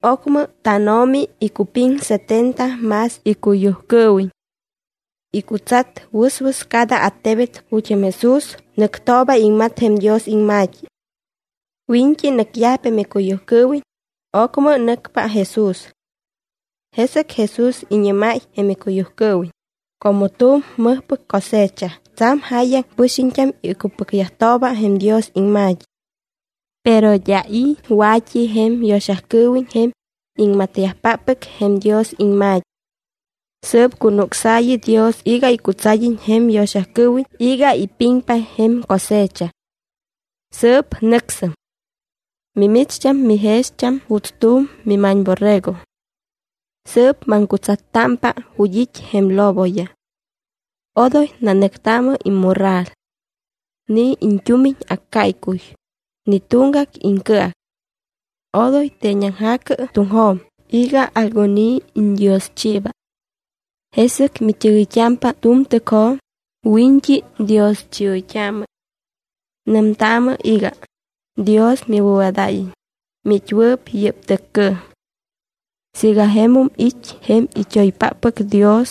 Ocmɨ tánO̱mi icupiŋ setenta más icuyujcɨɨwiñ. Icutsat wɨswɨs cada attebet ju̱t́ jém Jesús nɨctooba iŋmat jém Dios iŋma̱t́i. Wiñt́i nɨcyajpa jém icuyujcɨɨwiñ, ocmɨ nɨcpa Jesús. Jesɨc Jesús iñɨ́máy jém icuyujcɨɨwiñ: —Como tu̱m mɨjpɨc cosecha tsa̱m jáyaŋ pɨxiñt́am icupɨcyajtooba jém Dios iŋma̱t́i. Pero d́a i̱ wa̱t́i jém yo̱xacɨɨwiñ jém iŋmatyajpáppɨc jém Dios iŋma̱t́i. Sɨɨp cunucsaayɨ Dios iga icutsad́iñ jém yo̱xacɨɨwiñ iga ipiŋpa jém cosecha. Sɨɨp nɨcsɨm. Mimicht́am mijext́am juuts tu̱m mima̱ñborrego. Sɨɨp maŋcutsattámpa ju̱t́ it́ jém loboyaj. Odoy nanɨctaamɨ immorral, ni iñt́umiñ accáycuy, ni tuŋgac iŋcɨac. Odoy teeñaŋja̱cɨ tuŋjo̱m iga algun i̱ iñdioschiiba. Jesɨc mit́ɨgɨyt́ámpa tu̱m tɨcjo̱m, wiñt́i dioschioyt́aamɨ. Nɨmtaamɨ iga: “Dios miwɨ̱wadáyiñ, miit́wɨɨp yɨ́p tɨccɨɨm.” Siiga jemum it́ jém it́oypáppɨc Dios,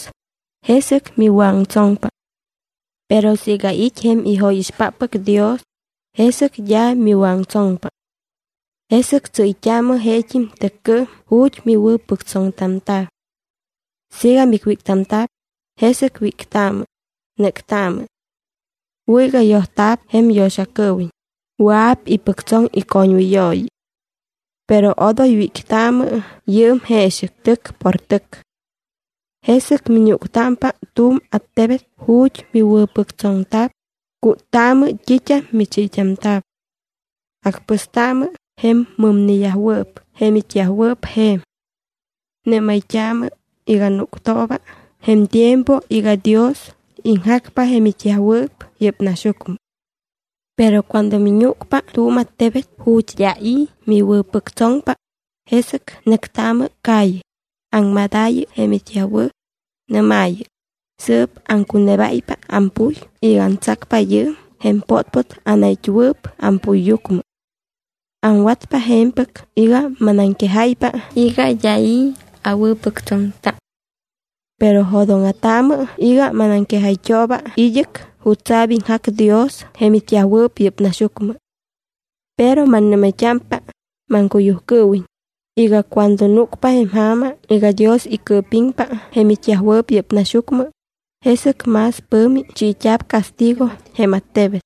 jesɨc miwɨ̱aŋtsoŋpa. Pero siiga it́ jém ijóyixpáppɨc Dios, jesɨc d́a miwɨ̱aŋtsoŋpa. Jesɨc tsɨ́yt́aamɨ jeet́im tɨccɨɨm ju̱t́ miwɨ̱pɨctsoŋtamta̱. Siiga micwíctamta̱p, jesɨc wíctaamɨ, nɨ́ctaamɨ. Wɨ̱ iga yojta̱p jém yo̱xacɨɨwiñ, wɨa̱p ipɨctsoŋ icoñwɨyooyi. Pero odoy wíctaamɨ yɨɨm jeexɨc tɨc por tɨc. Jesɨc miñúctámpa tu̱m attebet ju̱t́ miwɨ̱pɨctsoŋta̱p, cúttaamɨ t́it́am michiit́amta̱p. Acpɨstaamɨ jém mɨmneyajwɨɨp jém it́yajwɨɨp je̱m. Nɨ́mayt́aamɨ iga núctooba jém tiempo iga Dios iŋjacpa jém it́yajwɨɨp yɨ́p naxyucmɨ. Pero cuando miñúcpa tu̱m attebet ju̱t́ d́a i̱ miwɨ̱pɨctsoŋpa, jesɨc nɨctaamɨ calle, aŋmadaayɨ jém it́yajwɨɨp. Nɨ́maayɨ: “Sɨɨp aŋcunebáypa ampuy iga antsacpa yɨɨm jém pótpót jém anait́wɨɨp ampuyyucmɨ. Aŋwatpa je̱mpɨc iga manaŋquejáypa iga d́a i̱ awɨ̱pɨctsoŋta. Pero jo̱dóŋa̱taamɨ iga manaŋquejayt́ooba id́ɨc jutsa̱p iŋjac Dios jém it́yajwɨɨp yɨ́p naxyucmɨ.” Pero mannɨ́mayt́ámpa, maŋcuyujcɨɨwiñ, iga cuando núcpa jém ja̱ma iga Dios icɨɨpiŋpa jém it́yajwɨɨp yɨ́p naxyucmɨ, jesɨc más pɨ̱mi chiit́a̱p castigo jém attebet,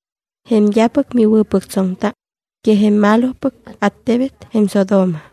jém d́apɨc miwɨ̱pɨctsoŋta, que jém malopɨc attebet jém Sodoma.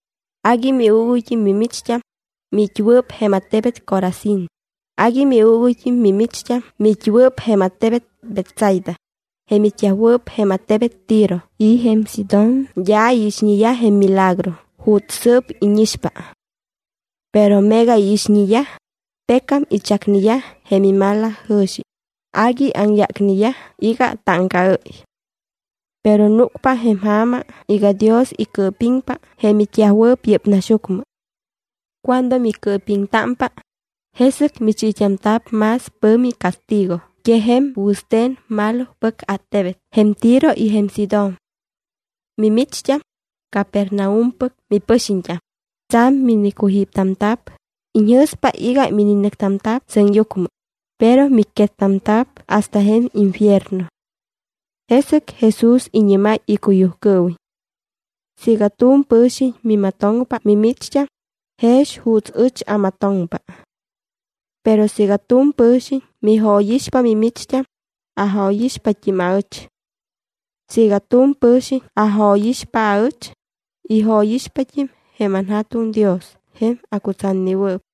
’¡Agui miuuguyt́im mimicht́am, miit́wɨɨp jém attebet Corazín! ¡Agui miuuguyt́im mimicht́am miit́wɨɨp jém attebet Betsaida! Jém it́yajwɨɨp jém attebet Tiro y jém Sidón d́a iixñeyaj jém milagro juuts sɨɨp íñixpa. Pero meega iixñeyaj, pecam ichacneyaj jém imalajɨ̱xi, agui aŋyácneyaj iga táŋcaɨ́y. Pero núcpa jém ja̱ma iga Dios icɨɨpiŋpa jém it́yajwɨɨp yɨ́p naxyucmɨ. Cuando micɨɨpiŋtámpa, jesɨc michiit́amta̱p más pɨ̱mi castigo que jém wɨste̱n malopɨc attebet jém Tiro y jém Sidón. Mimicht́am, Capernaumpɨc mipɨxiñt́am, tsa̱m minicujíptamta̱p, iñjɨ̱spa iga mininɨctamta̱p sɨŋyucmɨ, pero micquettamta̱p hasta jém infierno. Jesɨc Jesús iñɨ́máy icuyujcɨɨwiñ: —Siiga tu̱m pɨ̱xiñ mimatoŋpa mimicht́am, jex juuts ɨch amatoŋpa. Pero siiga tu̱m pɨ̱xiñ mijóyixpa mimicht́am, ajóyixpat́im aɨch. Siiga tu̱m pɨ̱xiñ ajóyixpa aɨch, ijóyixpat́im jém anJa̱tuŋ Dios jém acutsatnewɨɨp.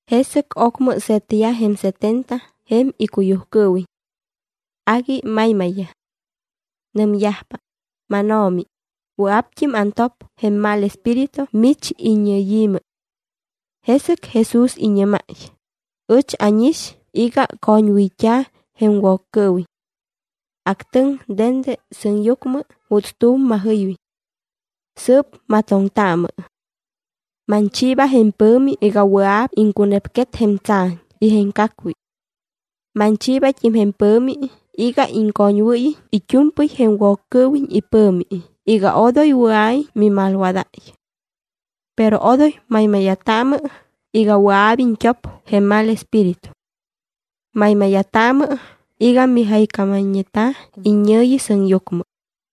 Jesɨc ocmɨ se̱tyaj jém setenta jém icuyujcɨɨwiñ. Agui maymayyaj. Nɨmyajpa: —MánO̱mi, wɨa̱pt́im antop jém mal espíritu mich iññɨyi̱mɨ. Jesɨc Jesús iñɨ́máy: —Ɨch ánix iga coñwɨyt́a̱ jém Woccɨɨwiñ. Actɨŋ dende sɨŋyucmɨ juuts tu̱m majɨywiñ. Sɨɨp matoŋtaamɨ. Manchiiba jém pɨ̱mi iga wɨa̱p iŋcunepquet jém tsa̱ñ y jém cacwi. Manchiibat́im jém pɨ̱mi iga iŋcoñwɨ́yiñ it́u̱mpɨy jém Woccɨɨwiñ ipɨ̱mi iga odoy wɨa̱iñ mimalwadáy. Pero odoy maymáya̱taamɨ iga wɨa̱p iñt́op jém mal espíritu. Maymáya̱taamɨ iga mijaycámayñeta̱ iññɨ̱yi sɨŋyucmɨ.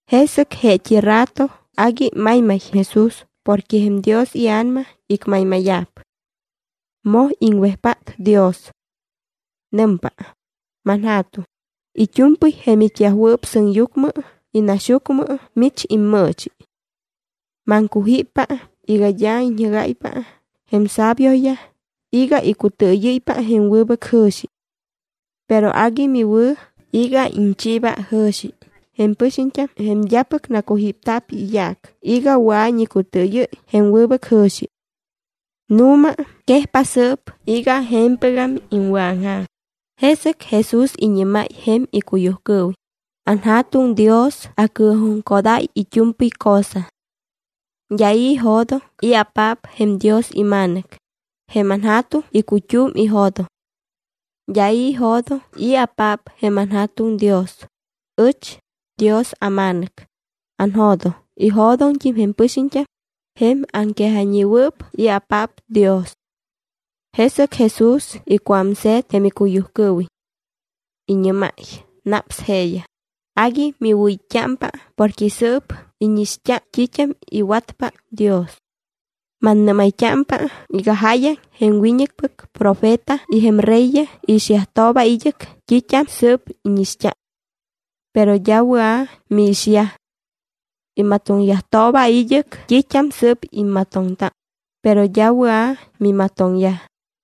Jesɨc jeet́i rato agui maymay Jesús porque jém Dios iA̱nama icmaymáya̱p. Moj iŋwejpát Dios. Nɨmpa: —ManJa̱tuŋ, it́u̱mpɨy jém it́yajwɨɨp sɨŋyucmɨ y naxyucmɨ mich immɨɨchi. Maŋcujíppa iga d́a iñjɨ́gáypa jém sabioyaj iga icutɨɨyɨ́ypa jém wɨbɨc jɨ̱xi. Pero agui miwɨ̱ iga iñchiiba jɨ̱xi jém pɨxiñt́am jém d́apɨc nacujípta̱p iyaac iga wɨa̱iñ icutɨɨyɨ́y jém wɨbɨc jɨ̱xi. Nu̱ma quejpa sɨɨp iga je̱mpɨgam iŋwɨ̱aŋja̱m. Jesɨc Jesús iñɨ́máy jém icuyujcɨɨwiñ: —AnJa̱tuŋ Dios acɨɨjuŋcodáy it́u̱mpɨy cosa. D́a i̱ ijo̱doŋ i̱apaap jém Dios iMa̱nɨc, jém anJa̱tuŋ icut́um ijo̱doŋ. D́a i̱ ijo̱doŋ i̱apaap jém anJa̱tuŋ Dios, ɨch, Dios aMa̱nɨc, anjo̱doŋ. Ijo̱doŋt́im jém pɨxiñt́am, jém aŋquejayñewɨɨp i̱apaap Dios. Jesɨc Jesús icuámse̱t jém icuyujcɨɨwiñ. Iñɨ́máy naps jeeyaj: —Agui miwɨ̱it́t́ámpa porque sɨɨp íñixt́a t́it́am iwatpa Dios. Mannɨ́mayt́ámpa iga jáyaŋ jém wiñɨcpɨc profeta y jém reyyaj iixyajtooba id́ɨc t́it́am sɨ́p íñixt́a. Pero d́a wɨa̱ miixyaj. Imatoŋyajtooba id́ɨc t́it́am sɨ́p immatoŋta, pero d́a wɨa̱ mimatoŋyaj.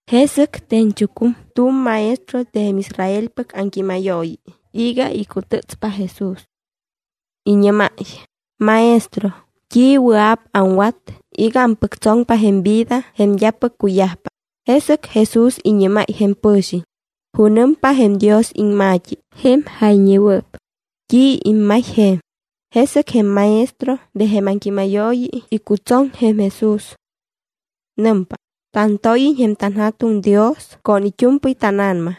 Jesɨc te̱ñchucum tu̱m maestro de jém Israelpɨc aŋquímayooyi iga icutɨtspa Jesús. Iñɨ́máy: —Maestro, ¿t́i wɨa̱p aŋwat iga ampɨctsoŋpa jém vida jém d́apɨc cuyajpa? Jesɨc Jesús iñɨ́máy jém pɨ̱xiñ: —¿Junɨmpa jém Dios iŋma̱t́i jém jayñewɨɨp? ¿T́i immay je̱m? Jesɨc jém maestro de jém aŋquímayooyi icutsoŋ jém Jesús. Nɨmpa: —Tantóyiñ jém tanJa̱tuŋ Dios con it́u̱mpɨy tána̱nama,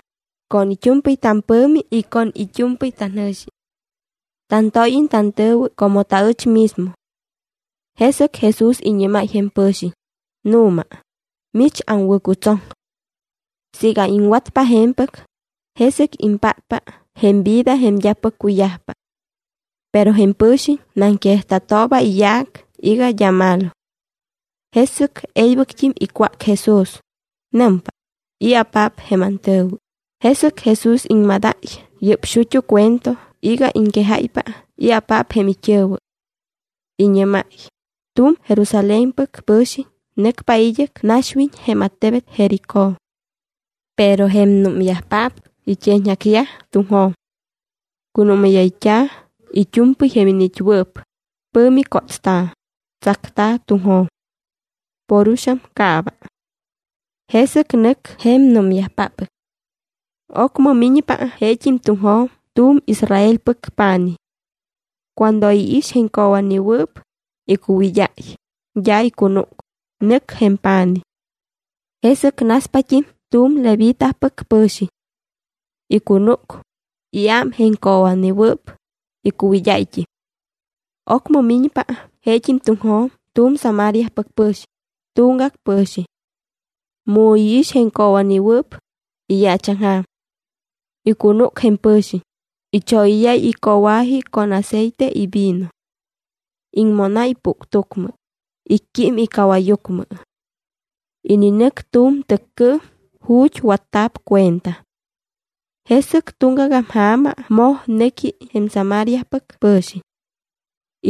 con it́u̱mpɨy tampɨ̱mi y con it́u̱mpɨy tanjɨ̱xi. Tantóyiñ tantɨ̱wɨ como taɨch mismo. Jesɨc Jesús iñɨ́máy jém pɨ̱xiñ: —Nu̱ma, mich aŋwɨ̱cutsoŋ. Siiga iŋwatpa je̱mpɨc, jesɨc impátpa jém vida jém d́apɨc cuyajpa. Pero jém pɨ̱xiñ naŋquejta̱tooba iyaac iga d́a malo. Jesɨc e̱ybɨct́im icwác Jesús. Nɨmpa: —¿I̱apaap jém antɨ̱wɨ? Jesɨc Jesús iŋmadáy yɨ́p xut́u cuento iga iŋquejáypa i̱apaap jém it́ɨ̱wɨ. Iñɨ́máy: —Tu̱m Jerusalénpɨc pɨ̱xiñ nɨcpa id́ɨc naxwiñ jém attebet Jericó. Pero jém númyajpaap it́eeñaŋjacyaj tuŋjo̱m. Cunúmáyayt́a̱ it́u̱mpɨy jém iniit́wɨɨp, pɨ̱mi cótsta̱, tsacta̱ tuŋjo̱m. Por uxaŋ caaba. Jesɨc nɨc jém númyajpáppɨc. Ocmɨ miñpa jeet́im tuŋjo̱m tu̱m Israelpɨc pa̱nij. Cuando iix jém coowa̱newɨɨp, icuwid́áy, d́a icunúc, nɨc jém pa̱nij. Jesɨc naspat́im tu̱m Levitapɨc pɨ̱xiñ. Icunúc, iám jém coowa̱newɨɨp, icuwid́áyt́im. Ocmɨ miñpa jeet́im tuŋjo̱m tu̱m Samariapɨc pɨ̱xiñ, tuŋgac pɨ̱xiñ. Mu iix jém coowa̱newɨɨp, iyaachaŋja̱m. Icunúc jém pɨ̱xiñ. Ichóyɨ́yáy icoowa̱ji con aceite y vino. Iŋmónáy puctucmɨ. Icquím icawajyucmɨ. Ininɨc tu̱m tɨccɨɨm ju̱t́ watta̱p cuenta. Jesɨc tuŋgagam ja̱ma moj nɨqui jém Samariapɨc pɨ̱xiñ.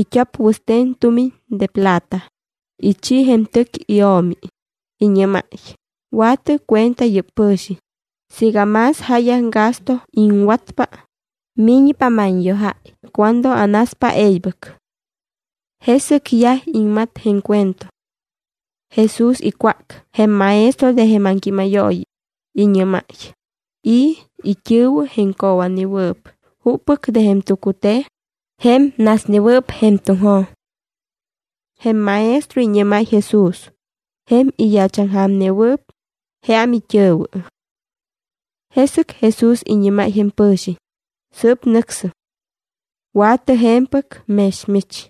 It́op wɨste̱n tumiñ de plata, ichi jém tɨc io̱mi. Iñɨ́máy: “Wa̱tɨ cuenta yɨ́p pɨ̱xiñ. Siiga más jáyaŋ gasto iŋwatpa, miñpa manyojáy cuando anaspa e̱ybɨc.” Jesɨc yaj iŋmat jém cuento. Jesús icwác jém maestro de jém aŋquímayooyi, iñɨ́máy: —¿I̱ it́ɨ̱wɨ jém coowa̱newɨɨp? ¿Juppɨc de jém tucute̱n, jém nasnewɨɨp jém tuŋjo̱m? Jém maestro iñɨ́máy Jesús: —Jém iyaachaŋja̱mnewɨɨp, jeam it́ɨ̱wɨ. Jesɨc Jesús iñɨ́máy jém pɨ̱xiñ: —Sɨɨp nɨcsɨm. Wa̱tɨ je̱mpɨc mex mich.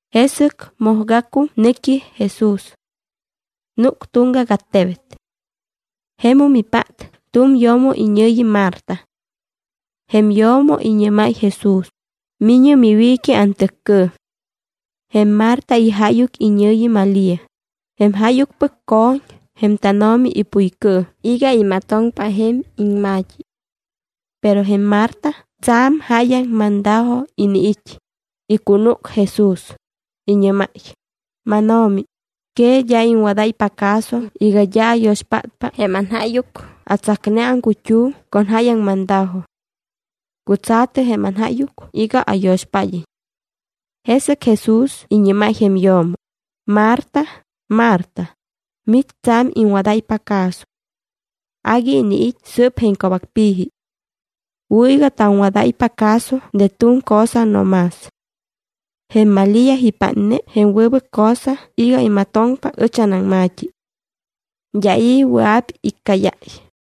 Jesɨc mojgacum nɨqui Jesús. Núc tuŋgac attebet. Jemum ipát tu̱m yo̱mo iñɨ̱yi Marta. Jém yo̱mo iñɨ́máy Jesús: —Mi̱ñɨ miwiiqui antɨccɨɨm. Jém Marta ijáyuc iñɨ̱yi Malía. Jém jáyucpɨc co̱ñ jém tánO̱mi ipuycɨɨm iga imatoŋpa jém iŋma̱t́i. Pero jém Marta tsa̱m jáyaŋ mandajo iniit́. Icunúc Jesús, iñɨ́máy: —¿MánO̱mi, que d́a iŋwadáypa caso iga d́a ayo̱xpátpa jém anjáyuc? Atsacne aŋcut́um con jáyaŋ mandajo. Cutsa̱tɨ jém anjáyuc iga ayo̱xpád́iñ. Jesɨc Jesús iñɨ́máy jém yo̱mo: —Marta, Marta, mich tsa̱m iŋwadáypa caso. Agui iniit́ sɨɨp jém co̱bacpi̱ji. Wɨ̱ iga taŋwadáypa caso de tu̱m cosa no más. Jém Malía ipátne jém wɨbɨc cosa iga imatoŋpa ɨch anaŋma̱t́i. D́a i̱ wɨa̱p iccáyáy.